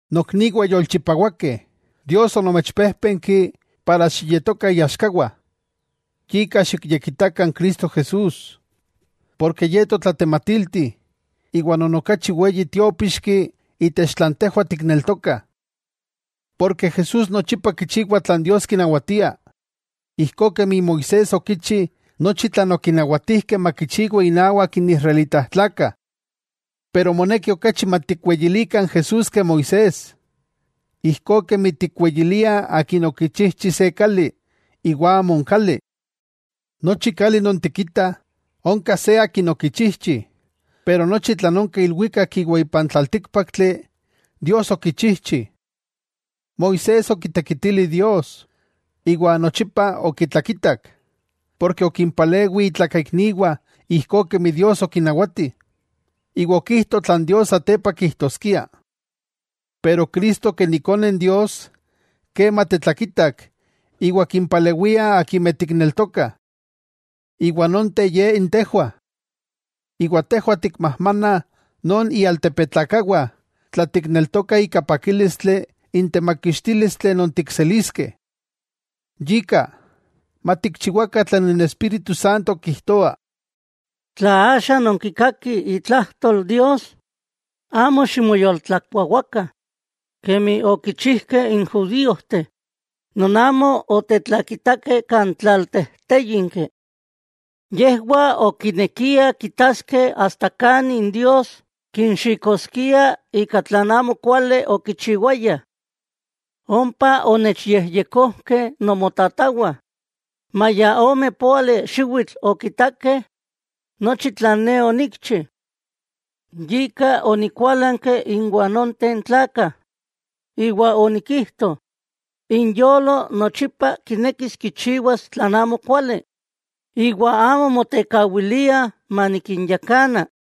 Nokniwah yolchipawakeh, Dios onomechpéjpenki para xiyetokah iaxkawah. Yika xikyekitakah n Cristo Jesús, porke Ye totlatematilti iwa non okachi weyi tiópixki itech tlan tejwah tikneltokah. Porke Jesús nochipa kichiwa tlan Dios kinawatia, ijkó kemi Moisés okichi nochi tlan okinawatijkeh makichiwa inawak n israelitajtlakah. Pero moneki okachi matikweyilikah n Jesús ke Moisés, ijkó kemi tikweyiliah akin okichijchi se kali, iwa amo n kali. Nochi kali non tikitah, onka se akin okichijchi, pero nochi tlan onka ilwikak iwa ipan tlaltíkpaktli, Dios okichijchi. Moisés okitekitili Dios, iwa nochipa okitlakitak, porke okimpalewi itlakaikniwah ijkó kemi Dios okinawati, iwa okijto tlan Dios satepa kijtoskia. Pero Cristo ken Ikone Dios, kema tetlakitak iwa kimpalewia akimeh tikneltokah, iwa nonteh ye n tejwah. Iwa tejwah tikmajmana non ialtepetlakawah tla tikneltokah ika pakílistli n temakixtílistli non tikseliskeh. Yika, matikchiwakah tlan Espíritu Santo kijtoa: Tla axa nonkikakih itlajtol Dios, amo ximoyoltlakuawakah, kemi okichijkeh n judíojteh, non amo otetlakitakeh kan tlaltejtéyinki. Yejwah okinekiah kitaskeh asta kani Dios kinxikoskia ika tlan amokuali okichiwayah. Ompa onechyejyekojkeh nomotatawah, maya ome póali xiwitl okitakeh nochi tlan ne onikchi. Yika onikuálanki inwah nonteh tlakah, iwa onikijto: “Inyolo nochipa kineki kichiwas tlan amokuali, iwa amo motekawiliah manikinyakana.”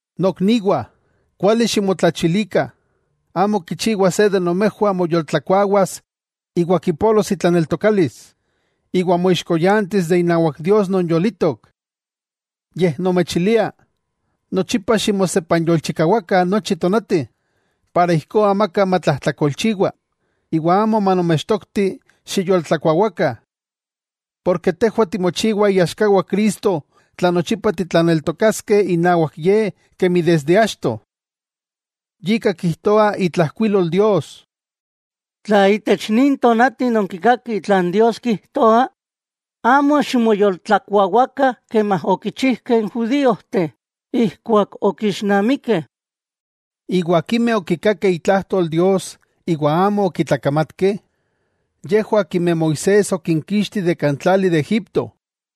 Nokniwah, kuali ximotlachilikah, amo kichiwa se de nomejwah moyoltlakuawas iwa kipolos itlaneltokalis, iwa moixkoyantis inawak Dios non yolitok. Yej nomechilia, nochipa ximosepanyolchikawakah nochi tonati, para ijkó amaka matlajtlakolchiwa, iwa amo manomechtokti xiyoltlakuawakah. Porke tejwah timochiwah iaxkawah Cristo tla nochipa titlaneltokaskeh inawak Ye kemi achto. Yika kijtoa itlajkuilol Dios: Tla itech nin tonati nonkikakih tlan Dios kijtoa, amo ximoyoltlakuawakah kemi okichijkeh n judíojteh ijkuak okixnamikeh. ¿Iwa akimeh okikakeh itlajtol Dios iwa amo okitlakamatkeh? Yejwah akimeh Moisés okinkixti de kan tlali de Egipto.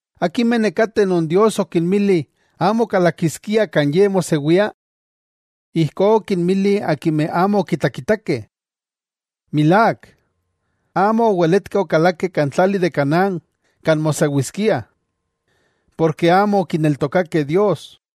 ¿Akimeh nekateh non Dios okinmili amo kalakiskiah kan Ye mosewia? Ijkó okinmili akimeh amo okitlakitakeh. Milák, amo oweletkeh okalakeh kan tlali de Canaán kan mosewiskiah, porke amo okineltokakeh Dios.